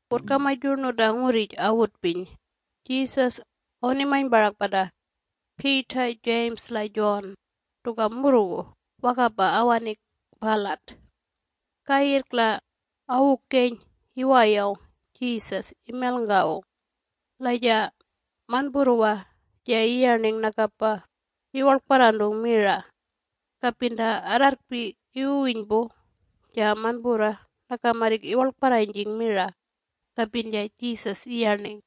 Wurrkamaj yurnu ta ngurrij awutpiny Jesus awunimany parak pata Peter, James la John tuka murrgu wakapa awaning palat. Kayirrk la awukeny iwayawng Jesus imelngawung. La ja manpurrwa ja iyarning nakapa iwarlkparrantung mira. Kapin ta arrarrkpi iwuwinypu ja manpurrwa naka marrik iwarlkparranyjing mira kapin ja Jesus iyarning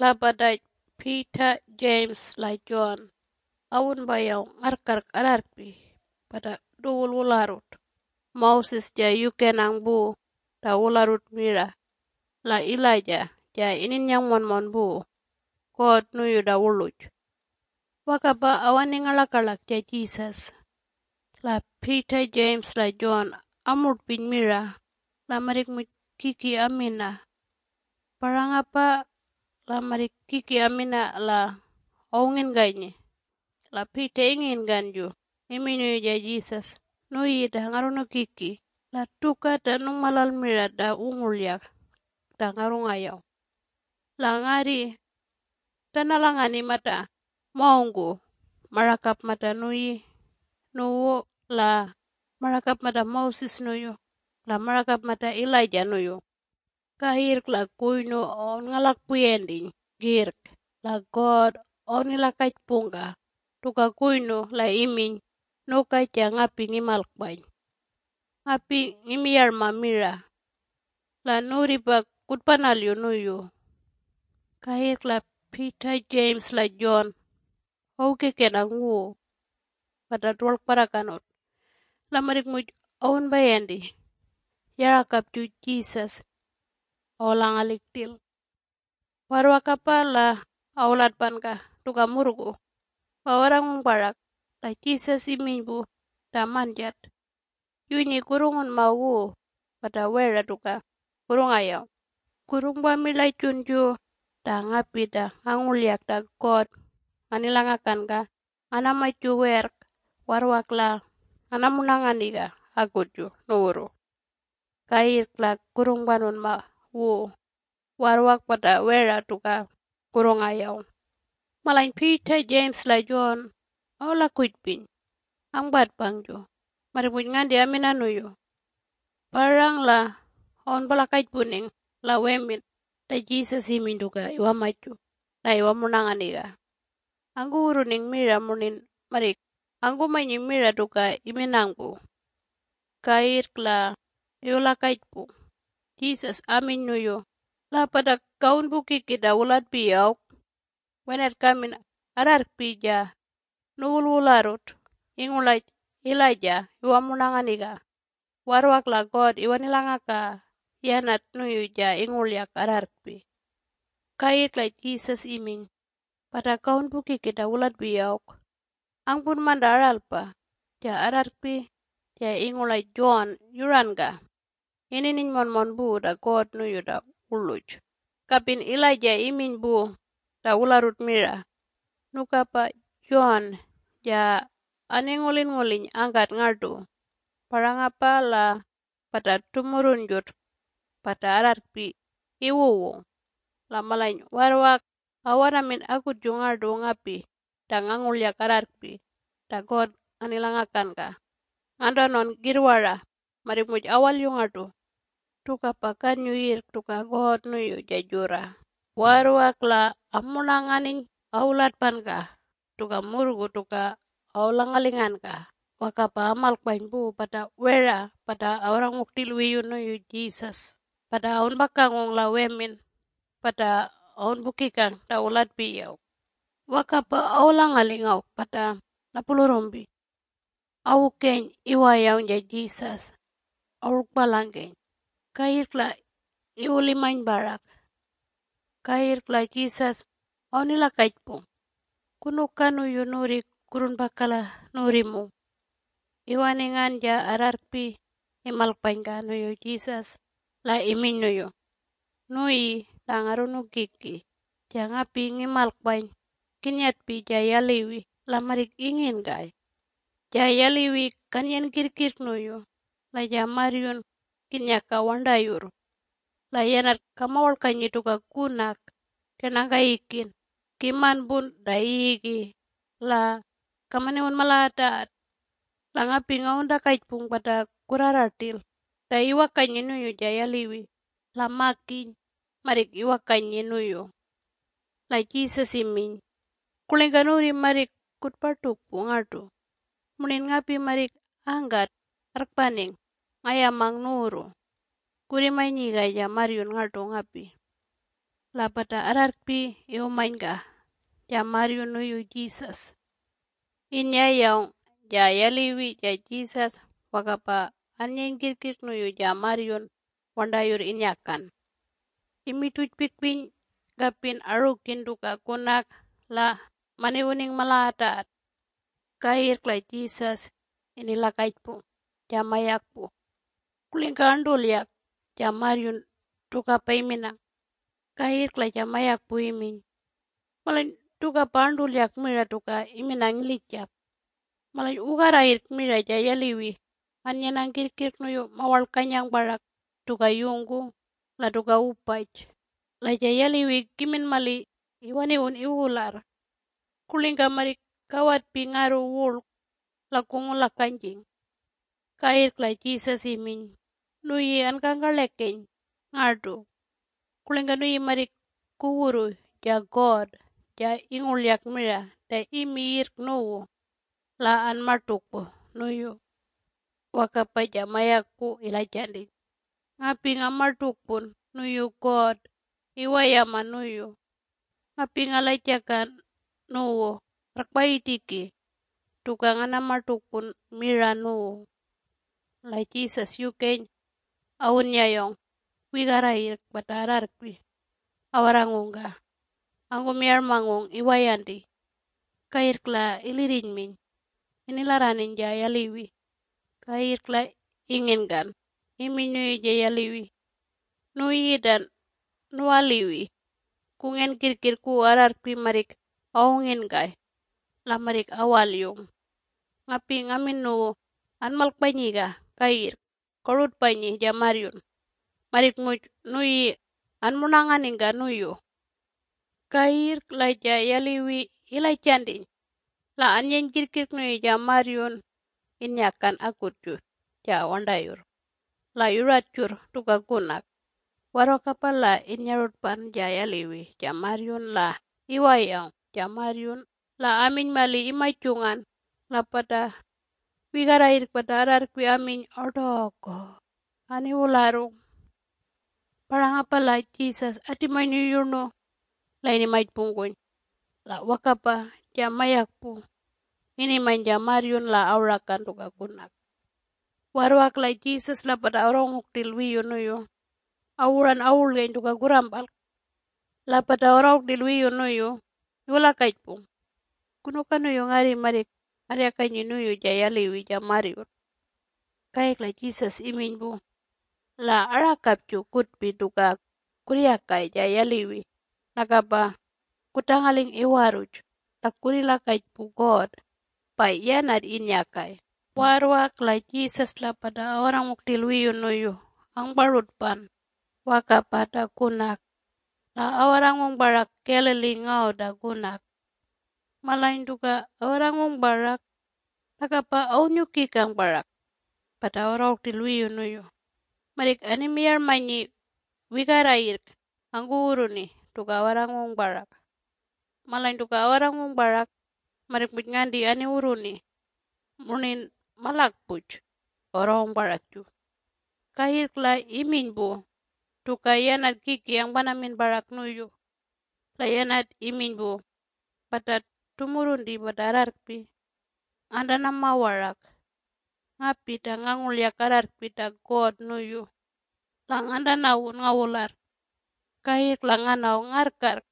La pata Peter, James la John awunpayawng ngarrkarrk arrarrkpi pata tuwul wularrut - Moses ja yukenang pu ta wularrut mira la Elijah ja ininnyang monmon pu God nuyu ta wurluj - wakapa awaning ngarlakarlak ja Jesus La Peter, James la John amurtpiny mira la marrik muj kiki amina. Parangapa la marrik kiki amina la awunginkanyi la Peter inginkanju iminy nuyu Jesus, “Nuyi ta Ngarrunukiki la tuka ta nungmalal mira ta wungurlyak ta ngarrungayawng! La ngarri ngatanalanganing mata mawngku marakap mata nuyi nuwu la marakap mata Moses nuyu la marakap mata Elijah nuyu!” Kayirrk la kuynu awunngalakpuyantiny kirrk la God awunilakajpungka tuka kuynu la iminy, “Nuka ja ngapi ngimalkpany ngapi ngimiyarma mira. La nuwurripa kutpanalyu nuyu!” Kayirrk la Peter, James la John awukekenang wu pata tuwarlkparrakanut la marrik muj awunpayanti. Yarakapju Jesus awulangaling rtil. Warrwakapa la awulatpanka tuka murrgu, pa awarrangung parak la Jesus iminy pu ta manjat, “Yunyi kurrungunma wu pata wera tuka kurrungayawng. Kurrungpamirlajunju ta ngapi ta ngangurlyak ta God nganilakangalanka nganamaju werrk warrwak la nganamurnanganiga akutju nuwurru. Kayirrk la kurrungpanunma wu warrwak pata wera tuka kurrungayawng.” Malany Peter, James la John awulakujpiny angpatpangju marrik muj nganti amina nuyu. Parang la awunpulakajpuning la wemin ta Jesus iminy tuka iwamaju la iwamurnanganiga. Angkuwurruning mira murnin marrik angkumanyi mira tuka iminang pu. Kayirrk la iwulakajpung Jesus aminy nuyu, “La pata kawunpukiki ta wulatpiyi awk? Wenat kamin arrarrkpi ja nuwulwularrut ingurlaj Elijah iwamurnanganiga warrwak la God iwanilangakaga yanat nuyu ja ingurlyak arrarrkpi.” Kayirrk la Jesus iminy, “Pata kawunpukiki ta wulatpiyi awk angpunman ta aralpa. Ja arrarrkpi ja ingurlaj John yurankapa inininy monmon pu ta God nuyu ta wurluj, kapin Elijah iminy pu ta wularrut mira. Nukapa John ja aningulinnguliny angkat ngartu, parangapa la pata tumurrunjut pata arrarrkpi iwuwung la malany warrwak awanamin akutju ngartu ngapi ta ngangurlyak arrarrkpi ta God nganilangakanka. Ngantanawn kirrwara marrik muj awalyung ngartu. Tukapa kanyu kirrk tuka God nuyu ja jurra.” Warrwak la amurnanganiny awulatpanka tuka murrgu tuka awulangalinganka wakapa amalkpany pu pata wera pata awarrangung rtil wiyu nuyu Jesus pata awunpakangung la wemin pata awunpukikang ta wulatpiyi awk. Wakapa awulangaling awk pata napulurrumpi. Awukeny iwayawng ja Jesus awurlkpalangkeny, kayirrk la iwulimany parak. Kayirrk la Jesus awunilakajpung, “Kunuka nuyu nuwurri kurrungpaka la nuwurrimung?” Iwaningan ja arrarrkpi imalkpanyka nuyu Jesus la iminy nuyu, “Nuyi ta Ngarrunukiki ja ngapi ngimalkpany kinnyatpi ja yaliwi la marrik inginkay. Ja yaliwi kannyen kirrkirrk nuyu la ja marryun kinnyaka warntayurr. La yanat kamawarlkanyi tuka kunak kernangkeyikin kimanpun ta yiyigi la kamaniwun malagatagat. La ngapi ngawuntakajpung pata kurrarra rtil ta iwakanyi nuyu ja yaliwi la makiny marrik iwakanyi nuyu.” La Jesus iminy, “Kurlingka nuwurri marrik kutpartukpu ngartu? Murnin ngapi marrik angkat arrkpaning ngayamang nuwurru. Kurrimanyiga ja marryun ngartu ngapi!” La pata arrarrkpi iwumanyka ja marryun nuyu Jesus. Innyayawng ja yaliwi ja Jesus wakapa annyeny kirrkirrk nuyu ja marryun warntayurr innyakan - imirtujpikpiny kapin arukin tuka kunak la maniwuning malagatagat. Kayirrk la Jesus inilakajpung ja mayakpu, “Kurlingka arntulyak ja marryun tukapa iminang?” Kayirrk la ja mayakpu iminy, “Malany tukapa arntulyak mira tuka iminang ilijap. Malany wugarra yirrk mira ja yaliwi annyenang kirrkirrk nuyu mawarlkanyang parak tuka yungku la tuka wupaj. La ja yaliwi kimin mali iwaniwun iwularr! Kurlingka marrik kawatping ngarru wurlk? La kungulakanyjing.” Kayirrk la Jesus iminy, “Nuyi ankangkarlekeny ngartu, Kurlingka nuyi marrik kuwurru ja God ja ingurlyak mira ta imi yirrk nuwu la anmartukpu nuyu?” Wakapa ja mayakpu ilajantiny, “Ngapi ngamartukpun nuyu God iwayama nuyu! Ngapi ngalajaka nuwu arrkpayirtiki tuka nganamartukpun mira nuwu!” La Jesus yukeny awunnyayawng wigarra yirrk pata arrarrkpi awarrangungka angkumiyarmangung iwayanti. Kayirrk la ilirrinyminy inilarraniny ja yaliwi kayirrk la inginkan iminy nuyu ja yaliwi, “Nuyi ta nuwaliwi kungen kirrkirrk wu arrarrkpi marrik awunginkay la marrik awalyung, ngapi ngamin nuwu anmalkpanyiga kayirrk korutpanyi ja marryun. Marrik muj nuyi anmurnanganingka nuyu!” Kayirrk la ja yaliwi ilajantiny la annyeny kirrkirrk nuyu ja marryun innyakan akutju ja warntayurr la yuratjurr tuka kunak, warrwakapa la innyarutpan ja yaliwi ja marryun la iwayawng ja marryun la aminy mali imajungan la pata wigarrayirrk pata arrarrkpi aminy, “Ortoko, aniwularrung!” Parangapa la Jesus atimany nuyu yurnu la inimajpungkuny la wakapa ja mayakpu inimany ja marryun la awurakan tuka kunak. Warrwak la Jesus la pata awarrangung rtil wiyu nuyu awuran awurlgeny tuka kurrampalk, la pata awarrangung rtil wiyu nuyu iwulakajpung, “Kunuka nuyu ngarri marrik ngarryakanyi nuyu ja yaliwi ja marryun?” Kayirrk la Jesus iminy pu, “La arakapju kutpi tuka kurryakay ja yaliwi nakapa kutangaling iwarruj la kurrilakajpu God pa yanat innyakay!” Warrwak la Jesus la pata awarrangung rtil wiyu nuyu angparutpan wakapa ta kunak la awarrangung parak Galilee ngaw ta kunak. Malany tuka awarrangung parak nakapa awunnyukikang parak pata awarrangung rtil wiyu nuyu. Marrik animiyarmanyi wigarrayirrk angkuwurruni tuka awarrangung parak. Malany tuka awarrangung parak marrik muj nganti aniwurruni murnin malakpuj awarrangung parakju. Kayirrk la iminy pu tuka yanat kiki angpanamin parak nuyu la yanat iminy pu, “Pata tumurrunti pata arrarrkpi ngantanama warak, ngapi ta ngangurlyak arrarrkpi ta God nuyu, la ngantanawun ngawularr. Kayirrk la nganaw ngarrkarrk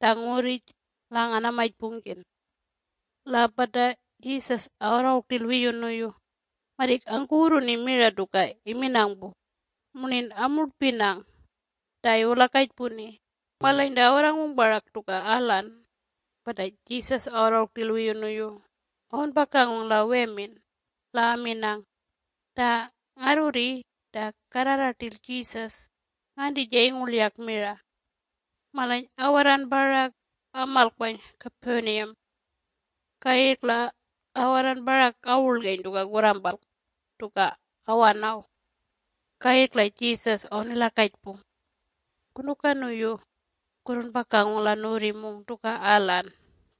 ta ngurrij la nganamajpungkin.” La pata Jesus awarrangung rtil wiyu nuyu marrik angkuwurruni mira tuka iminang pu murnin amurtpinang ta iwulakajpuni. Malany ta awarrangung parak tuka alan pata Jesus awarrangung rtil wiyu nuyu awunpakangung la wemin la aminang, “Ta Ngarrurri ta karrarra rtil Jesus nganti ja ingurlyak mira?” Malany awarran parak amalkpany Capernaum. Kayirrk la awarran parak awurlgeny tuka kurrampalk tuka awanaw. Kayirrk la Jesus awunilakajpung, “Kunuka nuyu kurrunpakangung la nuwurrimung tuka alan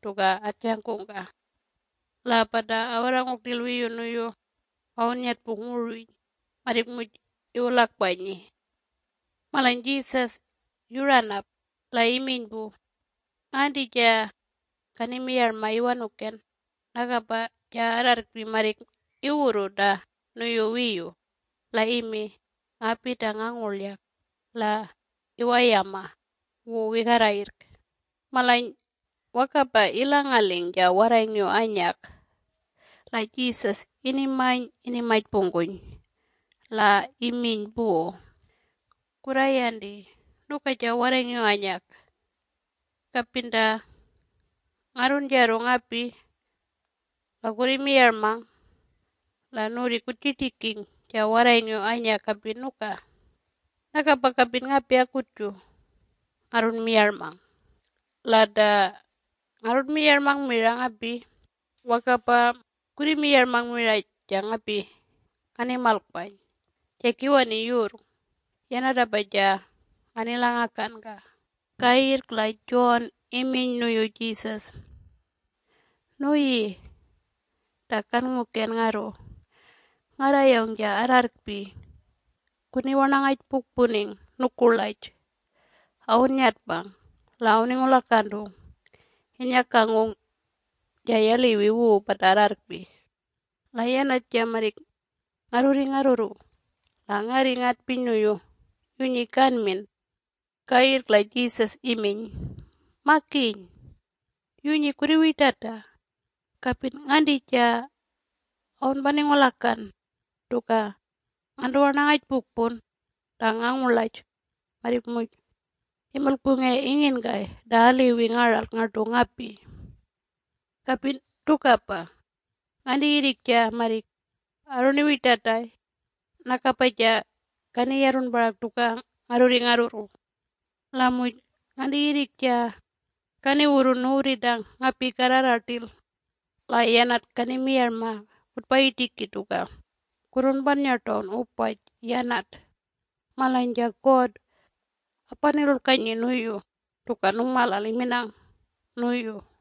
tuka atjangungka?” La pata awarrangung rtil wiyu nuyu awunnyatpung wurwiny marrik muj iwulakpanyi. Malany Jesus yuranap la iminy pu, “Nganti ja kanimiyarma iwanuken? Nakapa ja arrarrkpi marrik iwurru ta nuyu wiyu la imi ngapi ta ngangurlyak la iwayama wu wigarrayirrk.” Malany wakapa ilangaling ja warrayngiw anyak la Jesus inimany inimajpungkuny la iminy pu, “Kurrayanti nuka ja warrayngiw anyak. Kapin ta ngarrunjarru ngapi la kurrimiyarmang la nuwurri kutjirtiking ja warrayngiw anyak kapin nuka, nakapa kapin ngapi akutju ngarrunmiyarmang. La ta ngarrunmiyarmang mira ngapi wakapa kurriwamiyarma mira ja ngapi nganimalkpany ja kiwani yurrng. Yanatapa ja nganilangakanka. Kayirrk la John iminy nuyu Jesus, “Nuyi ta Kannguken ngarru, ngarrayawng ja arrarrkpi kuniwarnangajpukpuning nukurlaj awunnyatpang la awuningulakantung innyakangung ja yaliwi wu pata arrarrkpi la yanat ja marrik ngarrurri ngarrurru la ngarri ngatpiny nuyu, ‘Yunyi kanmin!’” Kayirrk la Jesus iminy, “Makiny! Yunyi kurriwirtata. Kapin nganti ja awunpaningulakan tuka ngantuwarnangajpukpun ta ngangurlaj marrik muj imilkpungay inginkay ta aliwi ngaralk ngartu ngapi. Kapin tukapa: nganti yirrik ja marrik arruniwirtatay nakapa ja kaniyarrun parak tuka ngarrurri ngarrurru. La muj nganti yirrik ja kaniwurrun nuwurri ta ngapi karrarra rtil la yanat kanimiyarma kutpayirtiki tuka kurrunpannyartawn wupaj yanat, malany ja God apanilulkanyi nuyu tuka nungmalal iminang nuyu.”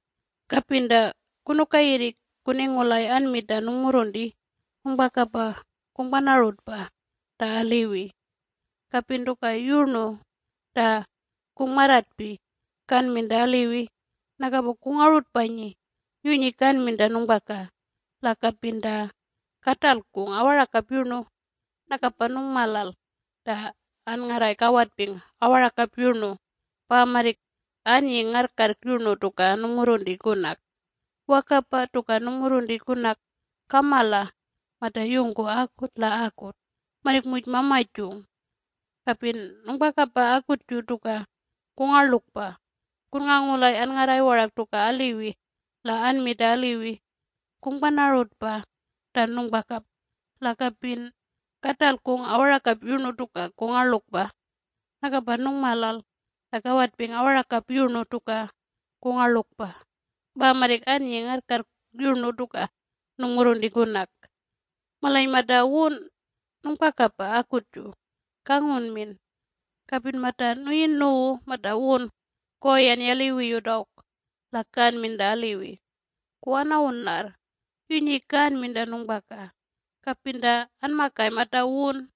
Kapin ta kunuka yirrik kuningulay anmi ta nungmurrunti nungpakapa kungpanarutpa ta aliwi. Kapin tuka yurnu ta kungmarrartpi kanmin ta aliwi nakapa kungarutpanyi yunyi kanmin ta nungpaka - la kapin ta katalkung awarakap yurnu. Nakapa nungmalal ta anngarray kawatping awarakap yurnu pa marrik annying ngarrkarrk yurnu tuka nungmurrunti kunak. Wakapa tuka nungmurrunti kunak kamala mata yungku akut la akut marrik muj mamajung! Kapin nungpakapa akutju tuka kungarlukpa kunngangulay anngarray warak tuka aliwi la anmi ta aliwi, kungpanarutpa ta nungpaka - la kapin katalkung awarakap yurnu tuka kungarlukpa. Nakapa nungmalal ta kawatping awarakap yurnu tuka kungarlukpa pa marrik annying ngarrkarrk yurnu tuka nungmurrunti kunak. Malany mata wun nungpakapa akutju kangunmin. Kapin mata nuyi nuwu mata wun koyan yaliwiyut awk la kanmin ta aliwi, kuwanawun larr yunyi kanmin ta nungpaka kapin ta anmakay mata wun.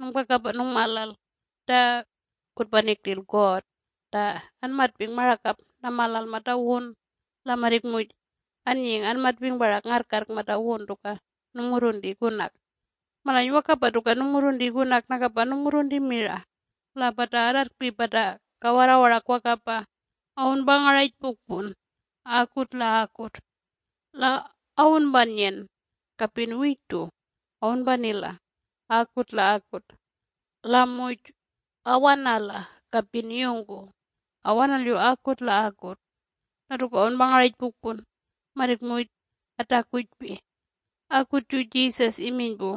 Nungpakapa nungmalal ta kutpaning rtil God ta anmatping marakap namalal mata wun la marrik muj annying anmatping parak ngarrkarrk mata wun tuka nungmurrunti kunak. Malany wakapa tuka nungmurrunti kunak nakapa nungmurrunti mira la pata arrarrkpi pata kawarrra warak wakapa awunpangarajpukpun akut la akut. La awunpannyen kapin wirtu awunpanila akut la akut la muj awanala kapin yungku awanalyu akut la akut. La tuka awunpangarajpukpun marrik muj antakujpi.” Akutju Jesus iminy pu,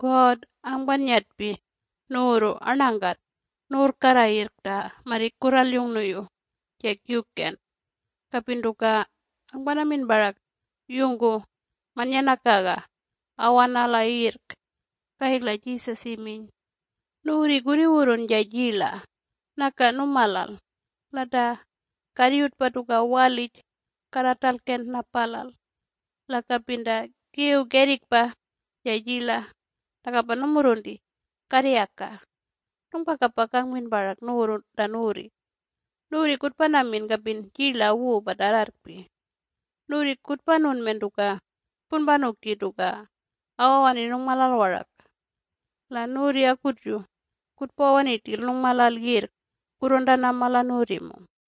“God angpannyatpi nuwurru arnangkat nuwurrkarra yirrk ta marrik kurralyung nuyu ja Kiwken. Kapin tuka angpanamin parak yungku mannyanakaga awanala yirrk.” Kayirrk la Jesus iminy, “Nuwurri kurriwurrun ja jirla naka numalal. La ta karryutpa tuka walij karratalken napalal. La kapin ta kiw kerrikpa ja jirla nakapa numurrunti karryaka. Nungpakapa kangmin parak nuwurru ta nuwurri. Nuwurri kutpanamin kapin jirla wu pata arrarrkpi. Nuwurri kutpanunmen tuka kutpunpanuki tuka awawani nungmalal warak. La nuwurri akutju kutpawani rtil nungmalal kirrk kurruntanama la nuwurrimung.”